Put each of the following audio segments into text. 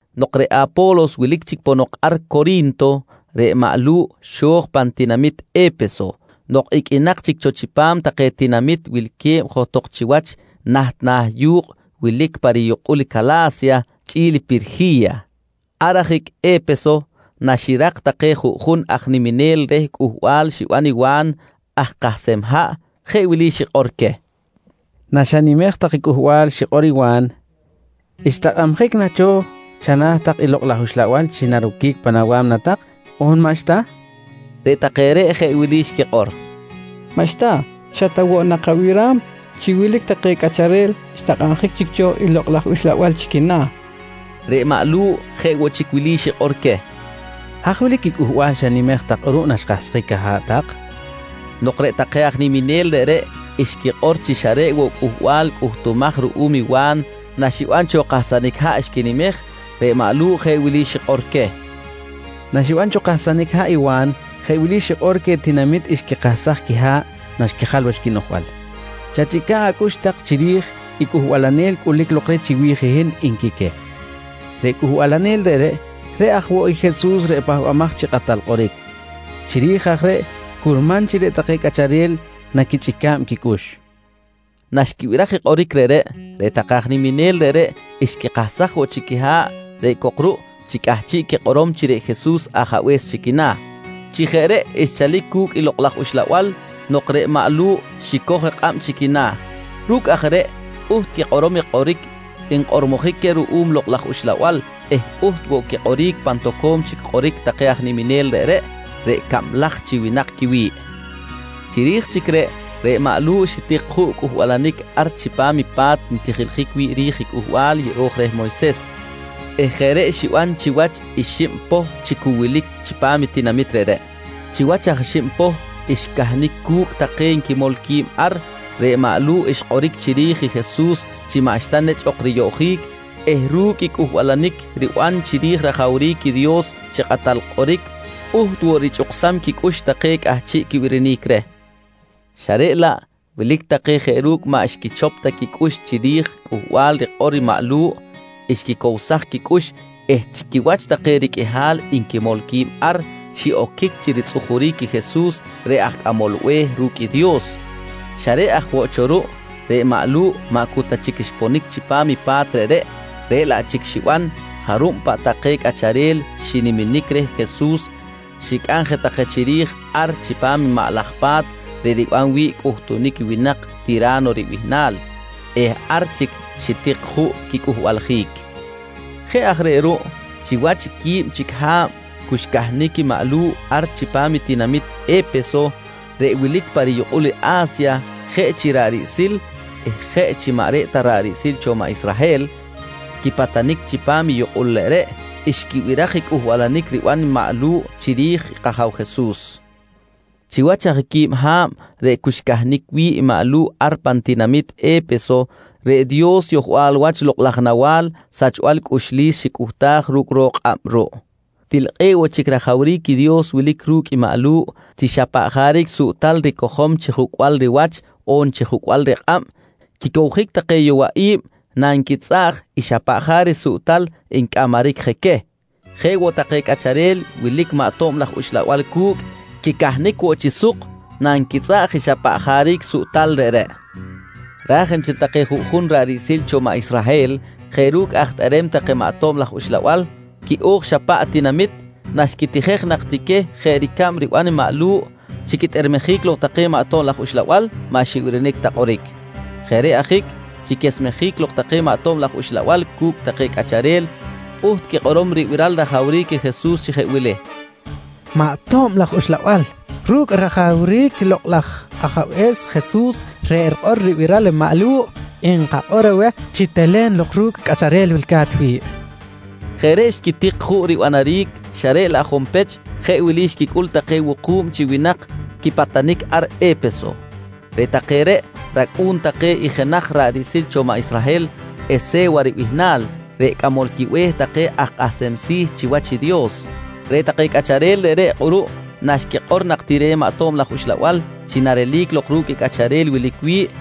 Nok reꞌ Apo̱los wilic chic ponok ar Cori̱nto, reꞌ maꞌ Lu̱ꞌ xo̱j pan tinamit E̱peso nok iqꞌuinak chic cho chipam take tinamit wilque̱b johtok chiwach naht na̱ yu̱kꞌ wilic pa riyukꞌul Cala̱sya chꞌi̱l Pirji̱ya. Ar ajic E̱peso naxirak take juꞌjun aj niminel reh cꞌuhbal xiban i Wa̱n aj kahsem haꞌ jeꞌ wili xikꞌor queh: «Naxanimej tak cꞌuhbal xikꞌor i Wa̱n, xtakꞌabjic na cho chana̱ tak i Lokꞌ laj Uxlabal chi naroquic pan awa̱mna tak on maꞌxta? nqui queh. Reꞌ take reꞌ jeꞌ wili xquikꞌor: «Maꞌxta! Xa ta woꞌ nak kabiram chi wilic take cꞌacharel xtakꞌabjic chic cho i Lokꞌ laj Uxlabal chi quina̱, nqui take. Reꞌ maꞌ Lu̱ꞌ jeꞌ woꞌ chic wili xikꞌor queh: «Haj wilic i cꞌuhbal xanimej tak kꞌuruꞌ naxkahsjic aha̱ꞌ tak? nqui queh. Nok reꞌ take aj niminel reꞌreꞌ xquikꞌor chi xa reꞌ woꞌ i cꞌuhbal cꞌuhtumaj ruꞌum i Wa̱n naxiban cho kahsanic haꞌ xquinimej, reꞌ maꞌ Lu̱ꞌ jeꞌ wili xikꞌor queh: «Naxiban cho kahsanic haꞌ i Wa̱n, jeꞌ wili xikꞌor queh tinamit xquikahsaj quiha̱ꞌ naxquijal wach quinoꞌjbal: ‹Chachꞌica̱ꞌ acꞌux tak chiri̱j i cꞌuhbalanel cꞌulic lok reh chiwi̱j i hin, nqui queh. «Reꞌ cꞌuhbalanel reꞌreꞌ, reꞌ aj woꞌ i Jesus reꞌ Pahbamaj chi Kꞌatal Kꞌoric. Chiri̱j aj reꞌ curman chi reꞌ take cꞌacharel naquichꞌica̱b quicꞌux, nqui maꞌ Lu̱ꞌ. Naxquibiraj i kꞌoric reꞌreꞌ, reꞌ take aj niminel reꞌreꞌ xquikahsaj woꞌ chic quiha̱ꞌ reꞌ cok ruꞌ chi cꞌahchiꞌ quikꞌorom chi reꞌ Jesus Ajabe̱s chi quina̱. Chi jeꞌ reꞌ xchalic cu̱cꞌ i Lokꞌ laj Uxlabal nok reꞌ maꞌ Lu̱ꞌ xicoj kꞌab chi quina̱. Ru̱cꞌ aj reꞌ pꞌuht quikꞌorom i kꞌoric nkꞌormojic queh ruꞌum Lokꞌ laj Uxlabal eh pꞌuht woꞌ quikꞌoric pan toco̱m chic kꞌoric take aj niminel reꞌreꞌ, reꞌ cablaj chi winak quiwi̱ꞌ. Chiri̱j chic reꞌ, reꞌ maꞌ Lu̱ꞌ xitik juꞌ cꞌuhbalanic ar chipam i pa̱t ntijiljic wi̱ꞌ i Cꞌuhbal Yeꞌo̱j reh Moyses eh jeꞌ reꞌ xiban chiwach i xib poh chi cu wilic chipam i tinamit reꞌreꞌ. Chiwach aj xib poh xcahnic cu̱cꞌ take nquimol qui̱b ar, reꞌ maꞌ Lu̱ꞌ xkꞌoric chiri̱j i Jesus chi maꞌxta nechꞌ ok riyoꞌjic eh ru̱cꞌ i cꞌuhbalanic riban chiri̱j rajawric i Dios chi kꞌatal kꞌoric, pꞌuht woꞌ richꞌuksam quicꞌux take cꞌahchiꞌ quibirinic reh. Xa reꞌ laꞌ wilic take jeꞌ ru̱cꞌ maꞌ xquichop ta quicꞌux chiri̱j cꞌuhbal rikꞌor maꞌ Lu̱ꞌ xquicowsaj quicꞌux eh chi quiwach take riqꞌuihal nquimol qui̱b ar xiꞌoquic chi ritzꞌujuric i Jesus reꞌ aj Cꞌamol Be̱h ru̱cꞌ i Dios. Xa reꞌ aj woꞌ cho ruꞌ, reꞌ maꞌ Lu̱ꞌ maꞌ cu ta chic xponic chipam i pa̱t reꞌreꞌ, reꞌ laꞌ chic xiban, jarub paꞌ take cꞌacharel xiniminic reh Jesus xicꞌam je take chiri̱j ar chipam i maꞌ laj pa̱t reꞌ riban wi̱ꞌ cꞌuhtunic i winak Tira̱no ribihnal eh ar chic xitik juꞌ quicꞌuhbaljic. Jeꞌ aj reꞌ ruꞌ chiwach i quib chic ha̱b cu xcahnic i maꞌ Lu̱ꞌ ar pan tinamit E̱peso reꞌ wilic pa riyukꞌul i A̱sya, jeꞌ chi ra̱ꞌ riꞌsil eh jeꞌ chi maꞌ reꞌ ta ra̱ꞌ riꞌsil cho maꞌ Israhel quipatanic chipam i yukꞌul reꞌreꞌ, xquibiraj i cꞌuhbalanic riban maꞌ Lu̱ꞌ chiri̱j kAja̱w Jesus. Chiwach aj quib ha̱b reꞌ cu xcahnic wi̱ꞌ i maꞌ Lu̱ꞌ ar pan tinamit E̱peso, reꞌ Dios yohbal wach lokꞌ laj nawa̱l sachbal cꞌuxlis xicꞌuhtaj ru̱cꞌ ro̱k kꞌab ruꞌ. Til kꞌe̱ꞌ woꞌ chic rajawric i Dios wilic ru̱cꞌ i maꞌ Lu̱ꞌ chi xa paꞌ jaric suꞌtal ricojom chi jucꞌbal riwach on chi jucꞌbal rikꞌab, quicowjic take yowaꞌi̱b nanquitzꞌaꞌj i xa paꞌ jaric suꞌtal ncꞌamaric je queh. Jeꞌ woꞌ take cꞌacharel wilic maꞌ tob laj uxlabal cu̱cꞌ, quicahnic woꞌ chi suk nanquitzꞌaꞌj i xa paꞌ jaric suꞌtal reꞌreꞌ. Raj nchel take juꞌjun ra̱ꞌ riꞌsil cho maꞌ Israhel jeꞌ ru̱cꞌ aj tꞌerem take maꞌ tob laj uxlabal quiꞌo̱j xa paꞌ tinamit, naxquitijej nak ti queh jeꞌ ricab riban i maꞌ Lu̱ꞌ chi quitꞌermejic lok take maꞌ tob laj uxlabal, maꞌ xibirinic ta kꞌoric. Jeꞌ reꞌ ajic, chi quesmejic lok take maꞌ tob laj uxlabal cu̱cꞌ take cꞌacharel pꞌuht quikꞌorom ribiral rajawric i Jesus chi jeꞌ wili: «Maꞌ tob laj uxlabal, ru̱cꞌ rajawric i Lokꞌ laj Ajabe̱s Jesus reꞌ rikꞌor ribiral i maꞌ Lu̱ꞌ, nkakꞌor aweh chi telen lok ru̱cꞌ cꞌacharel wilca̱t wi̱ꞌ, nqui nquikꞌor. Jeꞌ reꞌ xquitik juꞌ ribanaric xa reꞌ laꞌ junpech jeꞌ wilic xquicꞌul take wuku̱b chi winak quipatanic ar E̱peso. Reꞌ take reꞌ racꞌu̱n take i jenaj ra̱ꞌ riꞌsil cho maꞌ Israhel, Ese̱wa ribihnal reꞌ cꞌamol quibe̱h take aj kꞌahsem si̱ chiwach i Dios. Reꞌ take cꞌacharel reꞌreꞌ kꞌuruꞌ naxquikꞌor nak ti reh maꞌ tob laj uxlabal chi narelic lok ru̱cꞌ i cꞌacharel wilic wi̱ꞌ,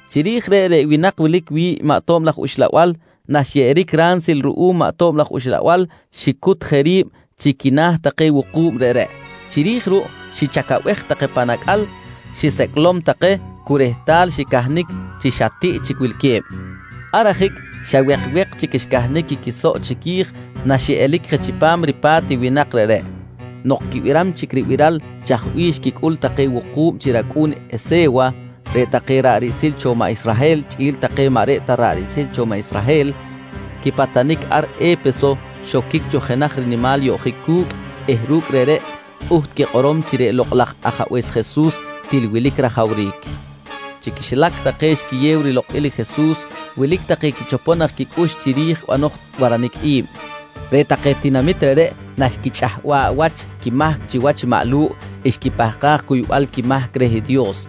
Chiri̱j reꞌ, reꞌ winak wilic wi̱ꞌ i maꞌ tob laj uxlabal naxyeꞌeric reh ransil ruꞌum maꞌ tob laj uxlabal, xicut je ri̱b chi quina̱ take wuku̱b reꞌreꞌ. Chiri̱j ruꞌ xichacabej take pan acꞌal, xisecꞌlom take cu rehtal xicahnic chi xa tiꞌ chic wilque̱b. Ar ajic xa wekwek chic xcahnic i quisoꞌ chiqui̱j naxiꞌelic je chipam ripa̱t i winak reꞌreꞌ. Nok quibiram chic ribiral chaj bih xquicꞌul take wuku̱b chi racꞌu̱n i Ese̱wa, reꞌ take ra̱ꞌ riꞌsil cho maꞌ Israhel chꞌi̱l take maꞌ reꞌ ta ra̱ꞌ riꞌsil cho maꞌ Israhel quipatanic ar E̱peso, xoquic cho jenaj rinimal yoꞌjic cu̱cꞌ eh ru̱cꞌ reꞌreꞌ pꞌuht quikꞌorom chi reꞌ Lokꞌ laj Ajabe̱s Jesus til wilic rajawric. Chi quixilac take xquiyew rilokꞌil i Jesus, wilic take quichopom nak quicꞌux chiri̱j banoj waranic i̱b. Reꞌ take tinamit reꞌreꞌ naxquichꞌahba̱ꞌ wach quimahc chiwach maꞌ Lu̱ꞌ, xquipahkaj cuybal quimahc reh Dios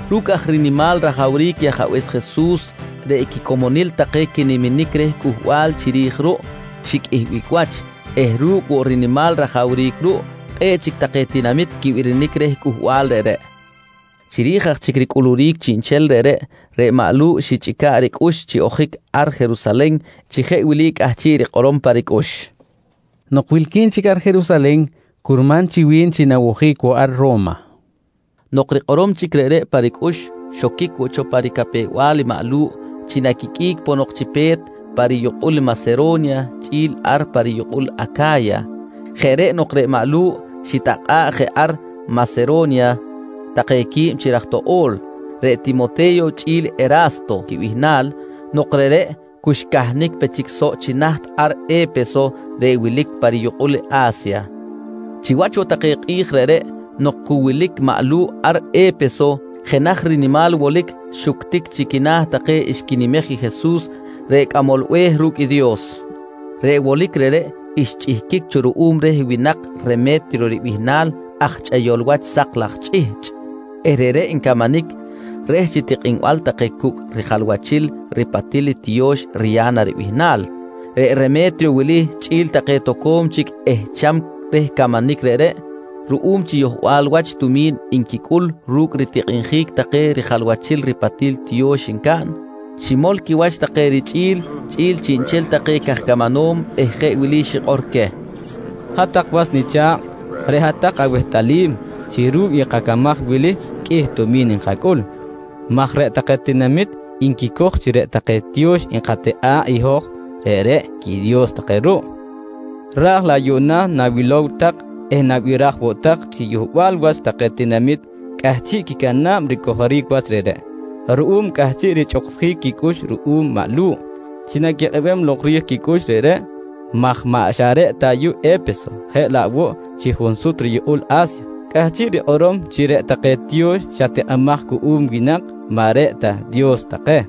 Ru̱cꞌ aj rinimal rajawric i Ajabe̱s Jesus, reꞌ quicomonil take quiniminic reh cꞌuhbal chiri̱j ruꞌ, xiqꞌuihbic wach eh ru̱cꞌ woꞌ rinimal rajawric ruꞌ, kꞌe̱ꞌ chic take tinamit quibirinic reh cꞌuhbal reꞌreꞌ. Chiri̱j aj chic ricꞌuluric chiꞌnchel reꞌreꞌ, reꞌ maꞌ Lu̱ꞌ xichꞌica̱ꞌ ricꞌux chi ojic ar Jerusalen chi jeꞌ wili cꞌahchiꞌ rikꞌorom pa ricꞌux: «Nok wilqui̱n chic ar Jerusalen, curman chi wi̱n chi nawojic woꞌ ar Ro̱ma, nqui cꞌahchiꞌ rikꞌorom pa ricꞌux. Nok rikꞌorom chic reꞌreꞌ pa ricꞌux, xoquic woꞌ cho pa ricapew-bal i maꞌ Lu̱ꞌ chi naquiqꞌuic ponok chi pe̱t pa riyukꞌul Masero̱nya chꞌi̱l ar pa riyukꞌul Aca̱ya. Jeꞌ reꞌ nok reꞌ maꞌ Lu̱ꞌ xitakꞌa̱ꞌ je ar Masero̱nya take quib chi raj toꞌo̱l, reꞌ Timote̱yo chꞌi̱l Era̱sto quibihnal nok reꞌreꞌ cu xcahnic pe chic soꞌ chi naht ar E̱peso reꞌ wilic pa riyukꞌul A̱sya. Chiwach woꞌ take kꞌi̱j reꞌreꞌ nok cu wilic maꞌ Lu̱ꞌ ar E̱peso, jenaj rinimal wolic xuctic chi quina̱ take xquinimej i Jesus reꞌ Cꞌamol Be̱h ru̱cꞌ i Dios. Reꞌ wolic reꞌreꞌ xchꞌihquic cho ruꞌum reh winak Reme̱triyo ribihnal aj chꞌeyol wach sak laj chꞌihchꞌ eh reꞌreꞌ ncamanic reh chi tikꞌinbal take cu̱cꞌ rijalwachil ripatil tiyo̱x Riya̱na ribihnal. Reꞌ Reme̱triyo wili chꞌi̱l take toco̱m rich ehcham reh camanic reꞌreꞌ, ruꞌum chi yohbal wach tumi̱n nquicꞌul ru̱cꞌ ritikꞌinjic take rijalwachil ripatil tiyo̱x ncaꞌn, ximol quiwach take richꞌi̱l chꞌi̱l chiꞌnchel take caj camanom eh jeꞌ wili xikꞌor queh: «Hat-tak was nicha̱kꞌ, reꞌ hat-tak awehtꞌalim chi ru̱cꞌ i kacamaj wili qꞌuih tumi̱n nkacꞌul maj reꞌ take tinamit nquicoj chi reꞌ take tiyo̱x nkatikꞌa̱ꞌ i hoj, reꞌreꞌ i quidios take ruꞌ. Raj laꞌ yuꞌna nawilom tak eh nabiraj woꞌ tak chi yohbal wach take tinamit cꞌahchiꞌ quicana̱b ricojoric wach reꞌreꞌ ruꞌum cꞌahchiꞌ richꞌuksjic quicꞌux ruꞌum maꞌ Lu̱ꞌ chi naquikꞌebem lok rij quicꞌux reꞌreꞌ, maj maꞌ xa reꞌ ta ayuꞌ E̱peso jeꞌ laꞌ woꞌ chi junsut riyukꞌul A̱sya cꞌahchiꞌ rikꞌorom chi reꞌ take tiyo̱x xa tikꞌimaj cuꞌum winak maꞌ reꞌ ta dios take.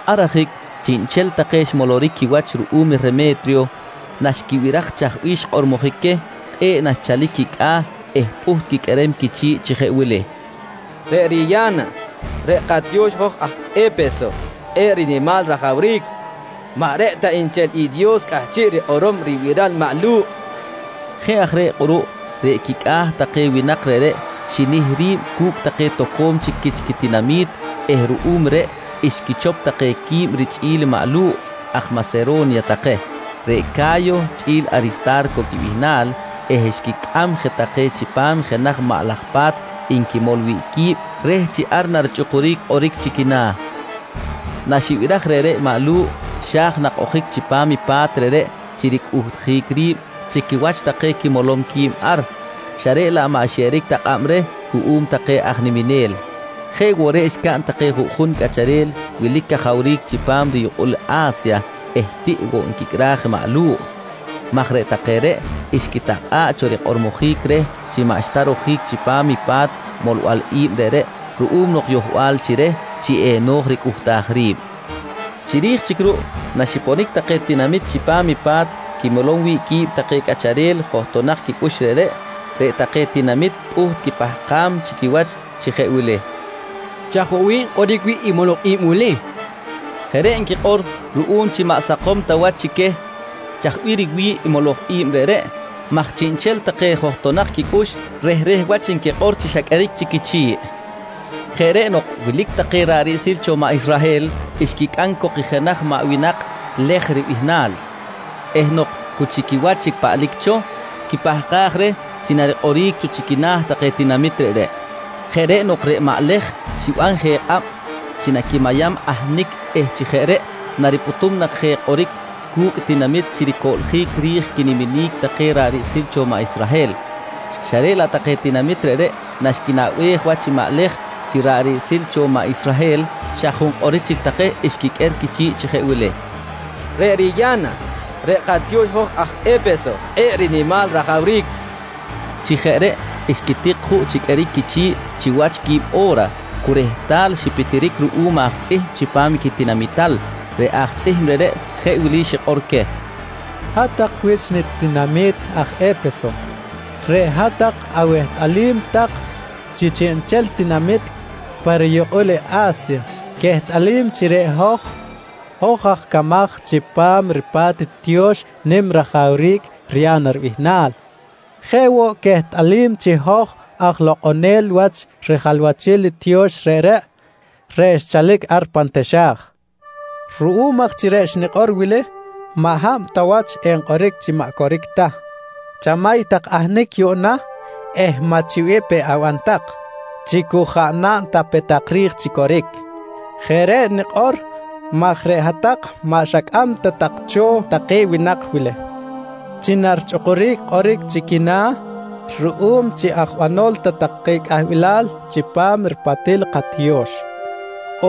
Ar ajic chiꞌnchel take xmoloric quiwach ruꞌum Reme̱triyo naxquibiraj chaj bih xkꞌormojic queh, kꞌe̱ꞌ naxchalic quicꞌa̱ eh pꞌuht quiqꞌuerem quichi̱ꞌ chi jeꞌ wili: «Reꞌ Riya̱na reꞌ katiyo̱x hoj aj E̱peso kꞌe̱ꞌ rinimal rajawric. Maꞌ reꞌ ta nchel i Dios cꞌahchiꞌ rikꞌorom ribiral maꞌ Lu̱ꞌ, nqui take. Jeꞌ aj reꞌ kꞌuruꞌ reꞌ quicꞌa̱ take winak reꞌreꞌ xinih ri̱b cu̱cꞌ take toco̱m chic quich quitinami̱t eh ruꞌum reꞌ xquichop take qui̱b richꞌi̱l maꞌ Lu̱ꞌ aj Masero̱nya take, reꞌ Ca̱yo chꞌi̱l Arista̱rco quibihnal eh xquicꞌam je take chipam jenaj maꞌ laj pa̱t nquimol wi̱ꞌ qui̱b reh chi ar richꞌukuric kꞌoric chi quina̱. Naxibiraj reꞌreꞌ i maꞌ Lu̱ꞌ, xa̱j nak ojic chipam i pa̱t reꞌreꞌ chi ricꞌuhtjic ri̱b chi quiwach take quimolom qui̱b ar, xa reꞌ laꞌ maꞌ xyeꞌeric ta kꞌab reh cuꞌum take aj niminel. Jeꞌ woꞌ reꞌ xcaꞌn take juꞌjun cꞌacharel wilic cajawric chipam riyukꞌul A̱sya eh tiꞌ woꞌ nquicꞌraj i maꞌ Lu̱ꞌ, maj reꞌ take reꞌ xquitakꞌa̱ꞌ cho rikꞌormojic reh chi maꞌxta rojic chipam i pa̱t molbal i̱b reꞌreꞌ ruꞌum nok yohbal chi reh chi eno̱j ricꞌuhtaj ri̱b. Chiri̱j chic ruꞌ naxiponic take tinamit chipam i pa̱t quimolom wi̱ꞌ qui̱b take cꞌacharel johtonak quicꞌux reꞌreꞌ, reꞌ take tinamit pꞌuht quipahkam chi quiwach chi jeꞌ wili: «Chaj woꞌ bih nkꞌoric wi̱ꞌ i moloj i̱b wili? nqui take. Jeꞌ reꞌ nquikꞌor ruꞌum chi maꞌ sakom ta wach chi queh chaj bih riwi̱ꞌ i moloj i̱b reꞌreꞌ, maj chiꞌnchel take johtonak quicꞌux, rehreh wach nquikꞌor chi xa qꞌueric chic quichi̱ꞌ. Jeꞌ reꞌ nok wilic take ra̱ꞌ riꞌsil cho maꞌ Israhel xquicꞌam cok i jenaj maꞌ winak Lej ribihnal eh nok cu chi quiwach chic paꞌlic cho, quipahkaj reh chi narikꞌoric cho chi quina̱ take tinamit reꞌreꞌ. Jeꞌ reꞌ nok reꞌ maꞌ Lej xiban je kꞌab chi naquimayam ahnic eh chi jeꞌ reꞌ naripꞌutum nak je kꞌoric cu̱cꞌ tinamit chi ricoꞌljic ri̱j quiniminic take ra̱ꞌ riꞌsil cho maꞌ Israhel, xa reꞌ laꞌ take tinamit reꞌreꞌ naxquinaꞌbej wach i maꞌ Lej chi ra̱ꞌ riꞌsil woꞌ cho maꞌ Israhel, xa junkꞌoric chic take xquiqꞌuer quichi̱ꞌ chi jeꞌ wili: «Reꞌ Riya̱na, reꞌ katiyo̱x hoj aj E̱peso, kꞌe̱ꞌ rinimal rajawric, nqui take. Chi jeꞌ reꞌ xquitik juꞌ chi qꞌueric quichi̱ꞌ chiwach quib o̱ra cu rehtal xipitiric ruꞌum aj tzꞌihm chipam quitinamital. Reꞌ aj tzꞌihm reꞌreꞌ jeꞌ wili xikꞌor queh: «Hat-tak wich nitinami̱t aj E̱peso, reꞌ hat-tak awehtꞌalim chi chiꞌnchel tinamit pa riyukꞌul i A̱sya quehtꞌalim chi reꞌ hoj, hoj aj camaj chipam ripa̱t i tiyo̱x nim rajawric Riya̱na ribihnal. Jeꞌ woꞌ quehtꞌalim chi hoj aj lokꞌonel wach rijalwachil i tiyo̱x reꞌreꞌ, reꞌ xchalic ar pan taxa̱j. Ruꞌum aj chi reꞌ xnikꞌor wili maꞌ hab ta wach enkꞌoric chi maꞌ coric ta, chamay tak ahnic yuꞌna eh maꞌ chi bih pe aban tak chi cu jaꞌ naꞌn ta pe tak ri̱j chi coric. Jeꞌ reꞌ nikꞌor maj reꞌ hat-tak maꞌ xacꞌam ta tak cho take winak wili chi narichꞌukuric kꞌoric chi quina̱ ruꞌum chi aj banol ta take cꞌahbilal chipam ripatil i katiyo̱x,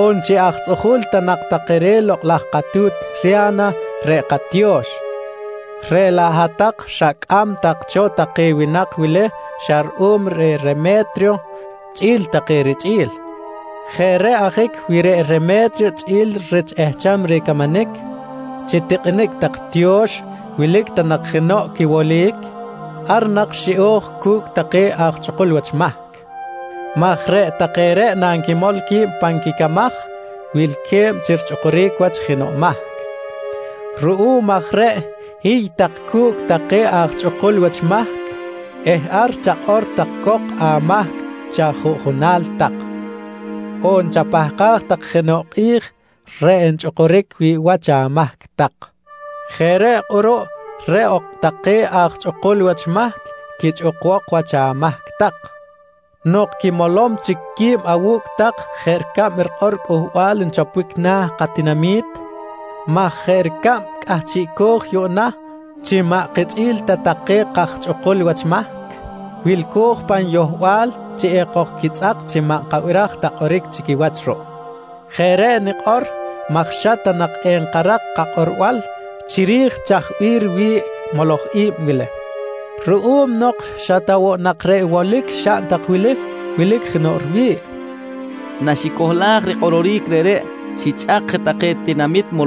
on chi aj tzꞌuju̱l ta nak take reh lokꞌ laj katu̱t Riya̱na reꞌ katiyo̱x, reꞌ laꞌ hat-tak xacꞌam tak cho take winak wili xa ruꞌum reh Reme̱triyo chꞌi̱l take richꞌi̱l. Jeꞌ reꞌ ajic wi reꞌ Reme̱triyo chꞌi̱l rich ehcham reh camanic chi tikꞌinic tak tiyo̱x wilic ta nak jenoꞌ quiwolic, ar nak xiꞌo̱j cu̱cꞌ take aj chꞌukul wach mahc maj reꞌ take reꞌ nanquimol qui̱b pan quicamaj, wilque̱b chi richꞌukuric wach jenoꞌ mahc. Ruꞌum aj reꞌ hiy tak cu̱cꞌ take aj chꞌukul wach mahc eh ar chakꞌor tak cok amahc chi ajuꞌjunal tak, on chapahkaj tak jenoꞌ kꞌi̱j reꞌ enchꞌukuric wi̱ꞌ wach amahc tak. Jeꞌ reꞌ kꞌuruꞌ reꞌ ok take aj chꞌukul wach mahc quichꞌukbok wach amahc tak nok quimolom chic qui̱b awu̱cꞌ tak jeꞌ ricab rikꞌor i cꞌuhbal nchoponic na̱ katinami̱t maj jeꞌ ricab cꞌahchiꞌco̱j yuꞌna chi maꞌ kichꞌi̱l ta take kaj chꞌukul wach mahc, wilco̱j pan yohbal chi ekojquitzꞌak chi maꞌ nkabiraj ta kꞌoric chi quiwach ruꞌ. Jeꞌ reꞌ nikꞌor maj xa ta nak enkarak kakꞌorbal chiri̱j chaj bih riwi̱ꞌ i moloj i̱b wili ruꞌum nok xa ta woꞌ nak reꞌ wolic xaꞌn tak wili, wilic jenoꞌ riwi̱ꞌ, nqui xikꞌor queh rich ritinami̱t.